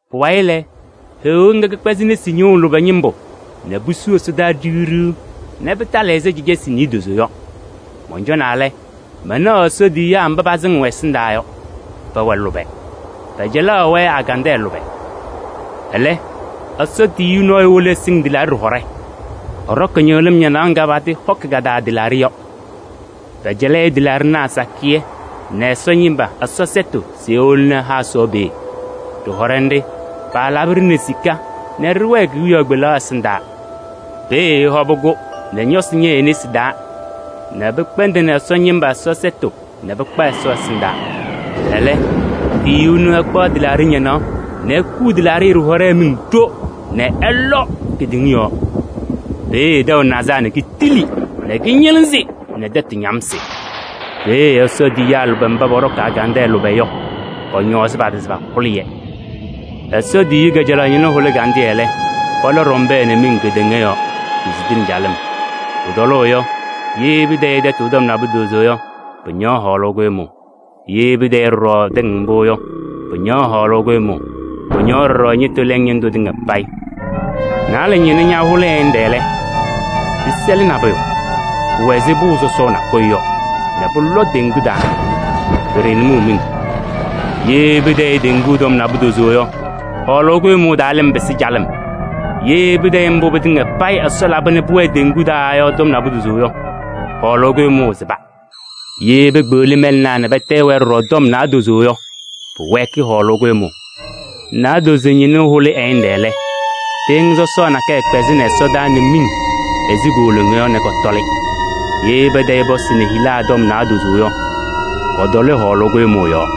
Pʋwayɩ lɛ, Heɣa ŋga kɛkpɛzɩ nesi ñɩɣʋ lʋbɛ ñɩmbʋ nɛ pusu ɛsɔdaa ɖiɣ ɖiɣ nɛ pɩtalɩ ɛzɩ cacasɩ niidozo yɔ. Mɔncɔnaa lɛ, manaɣ Ɛsɔ tiyiyaa mba pasɩŋɩɣ ɛ-ɛsɩndaa yɔ, pɛwɛ lʋbɛ. Pɛcɛlaɣaɣ-wɛ agandɛɛ lʋbɛ. Ɛlɛ, Ɛsɔ tiyiyu nɔɔyʋ wolo ɛsɩŋ tɩlaaɖɩ ɖɩhɔɖɛ. Ɛɖɔkɩ ñɩɣlɩm ñanaɣ ŋga patɩɩhɔkɩ ka-taa tɩlaaɖɩ yɔ. Pɛcɛlɩ-ɩ tɩlaaɖɩnaa sakɩyɛ nɛ Ɛsɔ ñɩma Ɛsɔ sɛtʋ se ewoni ɛha Ɛsɔ peeye. Ɖɩhɔɖɛ nɖɩ, paalabɩ-ɖɩ nɛ sika nɛ ɖɩwɛɛ kewiyaɣ kpelaɣ ɛsɩndaa. Peeye ɛhɔbɩ-kʋ nɛ ñɔsɩ ñɛyɩ e-nesi taa nɛ pɩkpɛndɩnɩ Ɛsɔ ñɩma Ɛsɔ sɛtʋ nɛ pɩkpa Ɛsɔ ɛsɩndaa. Ɛlɛ tiyiyu ɛnʋ ɛkpaɣ tɩlaaɖɩ ñanaɣ nɛ ekuu tɩlaaɖɩ ɖɩhɔɖɛ miŋ ɖo nɛ ɛlɔ kedeŋa yɔɔ. Peeye tɛʋ nazaa nɛ kitili nɛ kɩñɩlɩzɩ nɛ tɛtʋ ñamsɩ. Peeye Ɛsɔ tiyiyaa lʋbɛ mba pɔɖɔkɩ agandɛɛ lʋbɛ yɔ, pɔñɔɔzɩ pa-tɩ se pahʋlɩ-yɛ. Ɛsɔ tiyiyu kajalaɣ ñɩnʋ hʋlɩ ɛgandɩyɛ lɛ, pɔlɔ ɖɔmbɛɛ nɛ miŋ kedeŋa yɔɔ, pisidini calɩm. Pʋtɔlʋʋ yɔ, ye pɩtayɩ tɛtʋ tɔm naadozo yɔ, pɩñaɣ hɔɔlʋʋ kʋɖʋmʋʋ. Ye pɩtayɩ ɖɔɖɔ tɩŋ mbʋ yɔ, pɩñaɣ hɔɔlʋʋ kʋɖʋmʋʋ, pɩñaɣ ɖɔɖɔ ñɩtʋ lɛŋ ñɩndʋ tɩŋa payɩ. Naalɛ ñɩnʋ ñahʋlɩ ɛ-ñɩnɖɛ lɛ, pɩsɛlɩ nabʋyʋ, pʋwɛ ɛzɩ pʋʋ sɔsɔɔ nakʋyʋ yɔ nɛ pʋlɔ teŋgu taa, pɩɖaɣnɩ mʋʋ miŋ. Ye pɩtayɩ teŋgu tɔm naadozo yɔ, hɔɔlʋʋ kʋɖʋmʋʋ taa lɩm pɩsɩ calɩm. Ye pɩtayɩ mbʋ pɩtɩŋa payɩ Ɛsɔ laba nɛ pʋwɛɛ wezuu teŋgu taa yɔ tɔm naadozo yɔ, hɔɔlʋʋ kʋɖʋmʋʋ sɩba. Ye pekpeɣli mɛlɛnaa nɛ pɩtayɩ-wɛ ɖɔɖɔ tɔm naadozo yɔ, pʋwɛɛkɩ hɔɔlʋʋ kʋɖʋmʋʋ. Naadozo ñɩnʋ hʋlɩ ɛ-ñɩnɖɛ lɛ, tɩɩŋa sɔsɔɔ nakɛyɛ kpɛzɩnɩ ɛsɔdaa nɛ miŋ ɛzɩ kooloŋa yɔ nɛ kɔtɔlɩ. Ye pɩtayɩ pɔsɩ nɛ hila tɔm naadozo yɔ, kɔtɔlɩ hɔɔlʋʋ kʋɖʋmʋʋ yɔɔ.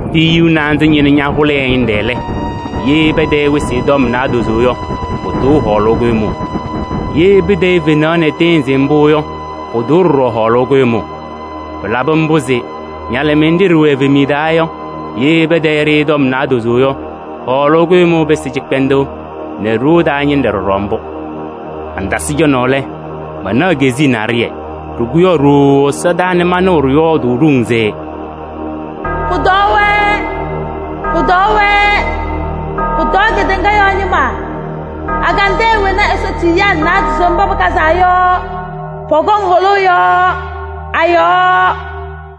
Tiyiyu naanza ñɩnʋ ñahʋlɩ ɛ-ñɩnɖɛ lɛ, ye pɩtayɩ wɩsɩ tɔm naadozo yɔ, pʋtʋʋ hɔɔlʋʋ kʋɖʋmʋʋ. Ye pɩtayɩ fenaɣ nɛ tɩɩnzɩ mbʋ yɔ, pʋtʋʋ ɖɔɖɔ hɔɔlʋʋ kʋɖʋmʋʋ. Pɩlabɩ mbʋ se ñalɩmɩyɛ nɖɩ ɖɩwɛ evemiye taa yɔ, ye pɩtayɩ-ɖɩ tɔm naadozo yɔ, hɔɔlʋʋ kʋɖʋmʋʋ pɩsɩ cɩkpɛndʋʋ nɛ ɖoo taa ñɩnɖɛ ɖɔɖɔ mbʋ. Mantasɩ cɔnaʋ lɛ, manaɣ keziye naɖɩyɛ, ɖɩkʋyaɣ ɖooo ɛsɔdaa nɛ manɩɣ ɖɩyɔɔdʋʋ ɖoŋ se: “Pʋtɔɔ-wɛ! Pʋtɔɔ-wɛ! Pʋtɔɔ kedeŋa yɔɔ ñɩma, agandɛɛ wena Ɛsɔ tiyiyaa naadozo mba pɩkazaa yɔ, pɔkɔŋ hʋlʋʋ yɔ a-yɔɔ!”